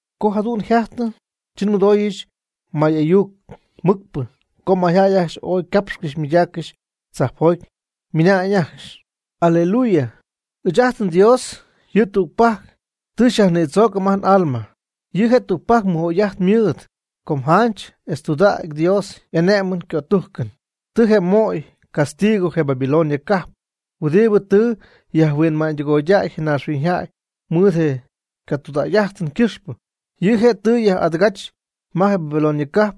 Co jadu'n yjajtɨ, chi nmɨdooyɨch may'ayuc mɨcpɨ co mayjäy ajcxy ooy ycapxcɨxy ymɨydaaccɨxy tzajpjoty, ymɨna'ñ ajcxy: ¡Aleluya! Ɨɨch ajt nDios yɨ' tügpajc tɨ xyajnïdzoocɨm ajt n'alma. Yɨ' je' tügpajc mɨj'oy'ajt mɨɨd. Com janch etz tudägy Dios y'ane'mɨn ycötujcɨn. Tɨ je' möy ycastigo je Babilonia cajp huɨdibɨ tɨ yajhuinma'ñydɨgoy je naaxhuiñyjäy mɨɨd je ycatudägy'ajtɨn ycɨxpɨ. Yɨ' je' tɨ yaj'adɨgach ma je Babilonia cajp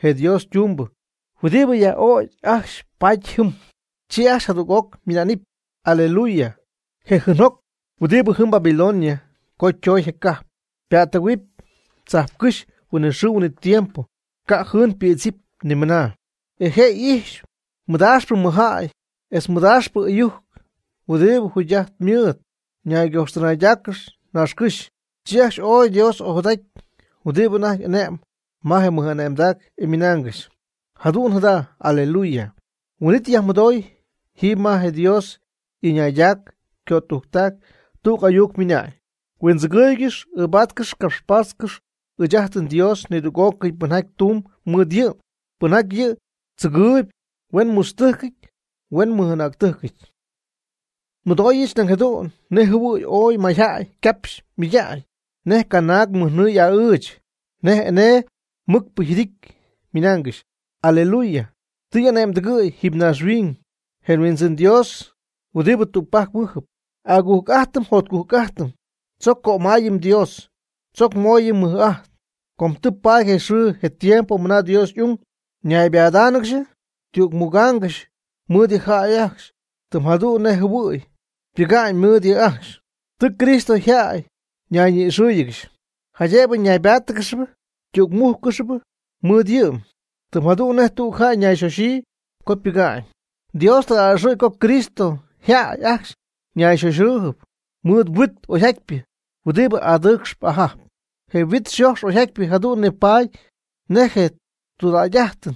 je Dios ytumbɨ, huɨdibɨ yaj'ögy ajcxy, pat jɨm. Chi ajcxy jadüg'oc ymɨnaanɨp: ―¡Aleluya! Je jɨɨnjoc huɨdibɨ jɨm Babilonia co ytoy je cajp, pa'ttɨgɨ̈huɨp tzajpcɨ́xy huinɨxɨɨ huinɨtiempo, ca' yjɨɨn ypïdzɨp ni mɨna. E je iipx madaaxpɨ mɨjjäy etz je madaaxpɨ ɨyujc, huɨdibɨ jugy'ajt mɨɨd ñaygojxtɨnaygɨdaacɨ naaxcɨ́xy, chi ajcxy ooy Dios ojadajty huɨdibɨ anajty ane'mb ma je mɨj'ane'mdac, e ymɨnaangɨxy: ―¡Jadu'n jada! ¡Aleluya! Huin'it yajmɨdooy jiiby ma je Dios y'ɨñaydac ycötujctac tüg ayuc ymɨna'ñ: Huindzɨgɨɨygɨx ɨɨbatcɨx capxpatcɨx ɨɨch ajt nDios nidüg'ócɨy pɨnjaty tumb mɨɨd yɨ', pɨnjaty yɨ' tzɨgɨɨyb, huen mutztɨjcɨty huen ymɨj'anäctɨjcɨty. Nmɨdoohuɨch nañ jadu'n nej jɨhuɨ̈y ooy mayjäy ycapxy ymɨydägy, nej canaag mɨjnɨɨ y'a'ɨɨch, nej enee mɨcpɨ yjɨdity, ymɨnaangɨxy: ¡Aleluya! Tɨ y'ane'mdɨgɨ̈y jiiby naaxhuiñ je Huindzɨn Dios huɨdibɨ tügpajc mɨ́jɨp. Agujc'ajtɨm jotcujc'ajtɨm, tzoc cömaayɨm Dios, tzoc mooyɨm mɨj'ajt. Com tɨ paady je xɨɨ je tiempo mɨna Dios y'ung naybadáanɨgɨxp tümugáanɨgɨxp mɨɨd yɨ' yjäy, tɨm jadu'n nej jɨhuɨ̈y ypɨga'ñ mɨɨd yɨ' ajcxy. Tɨ Cristo yjäy ñayñi'ixɨ́ɨyɨgɨxy, jaydëbɨ ñaybáatɨgɨxɨp ytügmújccɨxɨp mɨɨd yɨ', tɨm jadu'n nej tüg jäy ñayxoxyii co ypɨga'ñ. Dios tɨ a'ɨxɨ̈y co Cristo yjäy ajcxy ñayxoxɨɨyb mɨɨd yhuit oyjatypɨ, huɨdibɨ adɨɨcxp ajajp. Je huit xojx oyjatypɨ jadu'n nipaady nej je tudägy'ajtɨn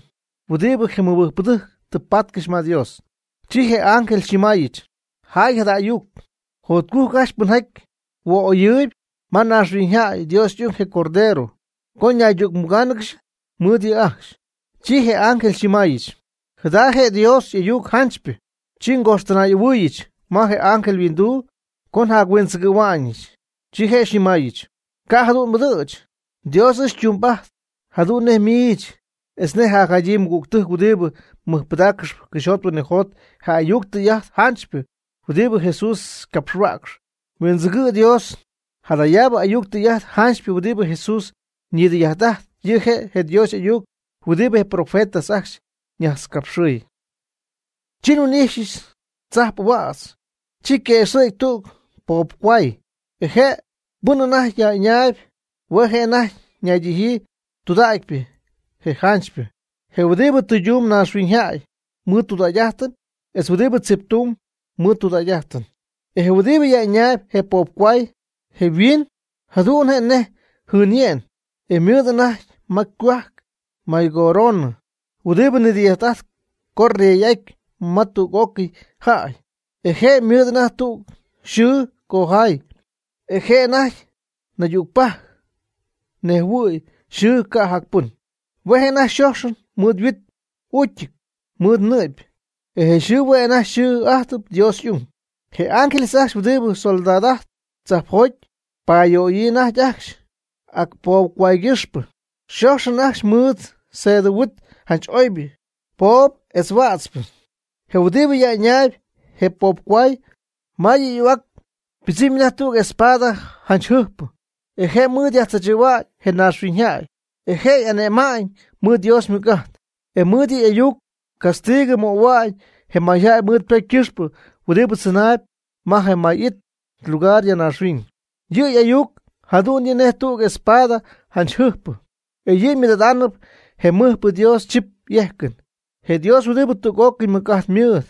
huɨdibɨ je mɨbɨjcpɨdɨjc tɨ paatcɨxy ma Dios. Chi je ángel xyñɨmaayɨch: ―Jaay jada ayuc. “Jotcujc ajcxy pɨnjaty huooyɨp ma yajhuinxɨɨduna'ñ Dios y'ung, je Cordero, co naydügmugáanɨgɨxy mɨɨd yɨ' yjäy ajcxy.” Chi je ángel xyñɨmaayɨch: ―Jada je' Dios y'ayuc janchypɨ. Chi ngojxtɨnay'ɨhuɨɨyɨch ma je ángel yhuinduu co njahuindzɨgɨ̈huaañɨch. Chi je' xyñɨmaayɨch: ―Ca' jadu'n m'ɨdɨ̈ch. Dios ɨɨch xytumbɨ'ajtp jadu'n nej miich etz nej jacjadyii mɨgügtɨjc huɨdibɨ mɨjpɨdaaccɨxp cɨxyjot huinɨjot je ayuc tɨy'ajt janchypɨ huɨdibɨ Jesús ycapxhuäcx. Huindzɨgɨ' Dios. Jadayaabɨ ayuc tɨy'ajt janchypɨ huɨdibɨ Jesús ñidɨy'ajt'ajt, yɨ' je' je Dios y'ayuc huɨdibɨ je profetas ajcxy ñajtzcapxɨɨy. Chi nhuin'ijxyɨch tzajp'ahuädz, chi yquëxɨ̈gy tüg poobcohuay, e je pɨn anajty yaj'ɨñaayb hue' anajty naydijyii je tudägypɨ je janchypɨ. Je huɨdibɨ tɨydumb naaxhuiñyjäy mɨɨd tudägy'ajtɨn etz huɨdibɨ tziptumb mɨɨd tudägy'ajtɨn. E je' huɨdibɨ yaj'ɨñaayb je poobcohuay, je' yhuiin jadu'n je' nej jɨɨnye'n, e ymɨɨd anajty ma ycohuajc maycoronɨ huɨdibɨ nidɨy'ajt'ajtp co yrey'aty ma tüg'ócɨy jäy. E je' ymɨɨd anajty tüg xɨɨ cojaay, e je' anajty naydügpajc nejhuɨɨyb yxɨɨ ca' jac pɨn. Hue' anajty yxoxyɨty mɨɨd huit y'uucyɨty mɨɨd nɨ'py, e je' yxɨɨ hue' anajty xɨɨ'adyii Dios y'ayuc. Je ángeles ajcxy huɨdibɨ soldad'ajtp tzajpjoty ypayöyii anajty ajcxy ac poobcohuaygɨxpɨ, yxoxyɨty ajcxy mɨɨd sedɨ huit janch oybɨ, poobɨ etz huätzpɨ. Je huɨdibɨ yaj'ɨñaayb je poobcohuay, ma yɨ' y'ahuac ypɨdzɨmy anajty tüg espada janch jɨjpɨ, e je' mɨɨd yajtzaachɨ̈hua'ñ je maynaaxhuiñyjäy. E je' ane'ma'ñ mɨɨd Dios ymɨc'ajt. E mɨɨd yɨ' y'ayuc castigɨ möhua'ñ je mayjäy mɨɨd ypocy ycɨxpɨ huɨdibɨ tzɨnaayb ma je may it lugar ya naaxhuiñ. Yɨ' y'ayuc jadu'n yɨ' nej tüg espada janch jɨjpɨ. E yɨ' mɨɨd'adaanɨp je mɨjpɨ Dios chip y'ejcɨn, je Dios huɨdibɨ tüg'ócɨy mɨc'ajt mɨɨd.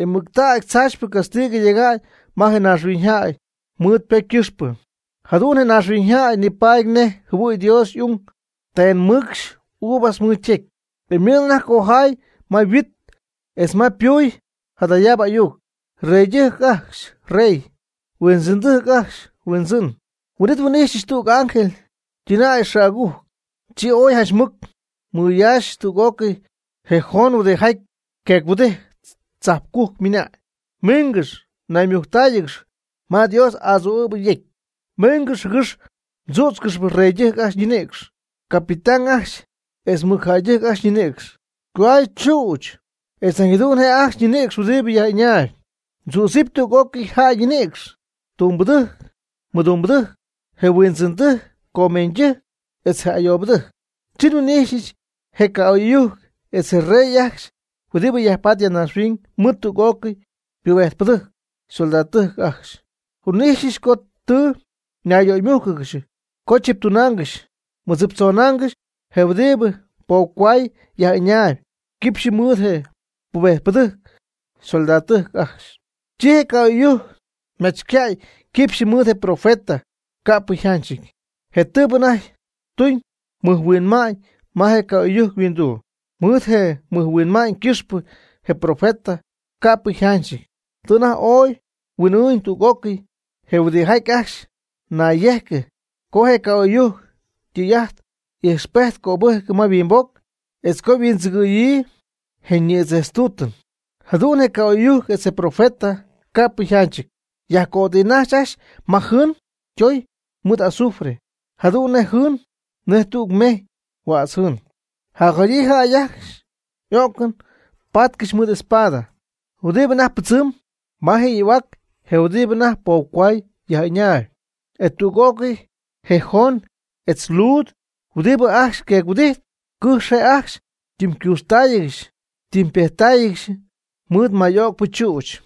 E mɨctägy tzaachypɨ castigɨ yega'ñ ma je mayñaaxhuiñyjäy mɨɨd ypocy ycɨxpɨ, jadu'n je maynaaxhuiñyjäy nipaady nej jɨhuɨ̈y Dios y'ung tenmɨcx uvas mɨɨd ytecy. E ymɨɨd anajty cojaay ma yhuit etz ma ypuy jadayaabɨ ayuc: “Reydɨjc ajcxy yrey. Huindzɨndɨjc ajcxy yHuindzɨn.” Huin'it nhuin'ijxyɨch tüg ángel ytɨnäy xɨɨ'agujc, chi ooy janch mɨc mɨyaaxy tüg'ócɨy je joon huɨdijaty queec-huɨdijtp tzajpcujc ymɨnañ: ―Miingɨx naymujctáayɨgɨx ma Dios adzuu'ɨ̈bɨ yecy. Miingɨx, jɨgɨx mdzüdzcɨxɨpy reydɨjc ajcxy ñinïcx, capitán ajcxy etz mɨcjäydɨjc ajcxy ñinïcx, cohuay chüch etz nañ jadu'n je' ajcxy ñinïcx huɨdibɨ yaj'ɨñaayb. Mdzüdzɨp tüg'ócɨy jäy ñinïcx: tumbɨdɨjc mɨdumbɨdɨjc, je huindzɨndɨjc, comeeñydɨjc etz je ayoobɨdɨjc. Chi nhuin'ijxyɨch je ca'oy'ɨyujc etz je rey ajcxy huɨdibɨ yajpatp ya naaxhuiñ mɨɨd tüg'ócɨy ypubejtpɨdɨjc ysoldadotɨjc ajcxy. Nhuin'ijxyɨch co tɨ ñayyöymújcɨgɨxy co chiptunaangɨxy mɨdziptzonaangɨxy je huɨdibɨ poobcohuay yaj'ɨñaayb quipxyɨ mɨɨd je' ypubejtpɨdɨjc ysoldadtɨjc ajcxy. Chi je ca'oy'ɨyujc ymachycäy quipxyɨ mɨɨd je profeta ca'pɨ yjanchɨty, je tɨɨbɨ anajty tuñ mɨjhuinma'ñ ma je ca'oy'ɨyujc yhuinduu. Mɨɨd je mɨjhuinma'ñ ycɨxpɨ je profeta, ca'pɨy yjanchɨty, tɨ anajty ooy huin'ɨɨñ tüg'ócɨy je huɨdijaty ajcxy nayyejcɨ co je ca'oy'ɨyujc ytɨy'ajt ijxpejt cöbɨjcɨ ma yhuimboc etz co huindzɨgɨɨyɨ je ñïdzejtztuutɨn. Jadu'n je ca'oy'ɨyujc etz je profeta, ca'pɨy yjanchɨty, yajcötijnajxy ajcxy ma jɨɨn ytoy mɨɨd azufre, jadu'n je jɨɨn nej tüg mejy huädz jɨɨn. Jacjadyii jäy hue' ajcxy o'cɨn patcɨxy mɨɨd espada huɨdibɨ anajty pɨdzɨmb ma je' y'ahuac je huɨdibɨ anajty poobcohuay yaj'ɨñaayb. E tüg'ócɨy je joon etz luud huɨdibɨ ajcxy queec-huɨdijtp cɨjx je' ajcxy ytɨmycuuxtáayɨgɨxy ytɨmypejttáayɨgɨxy mɨɨd may öcpɨ chüch.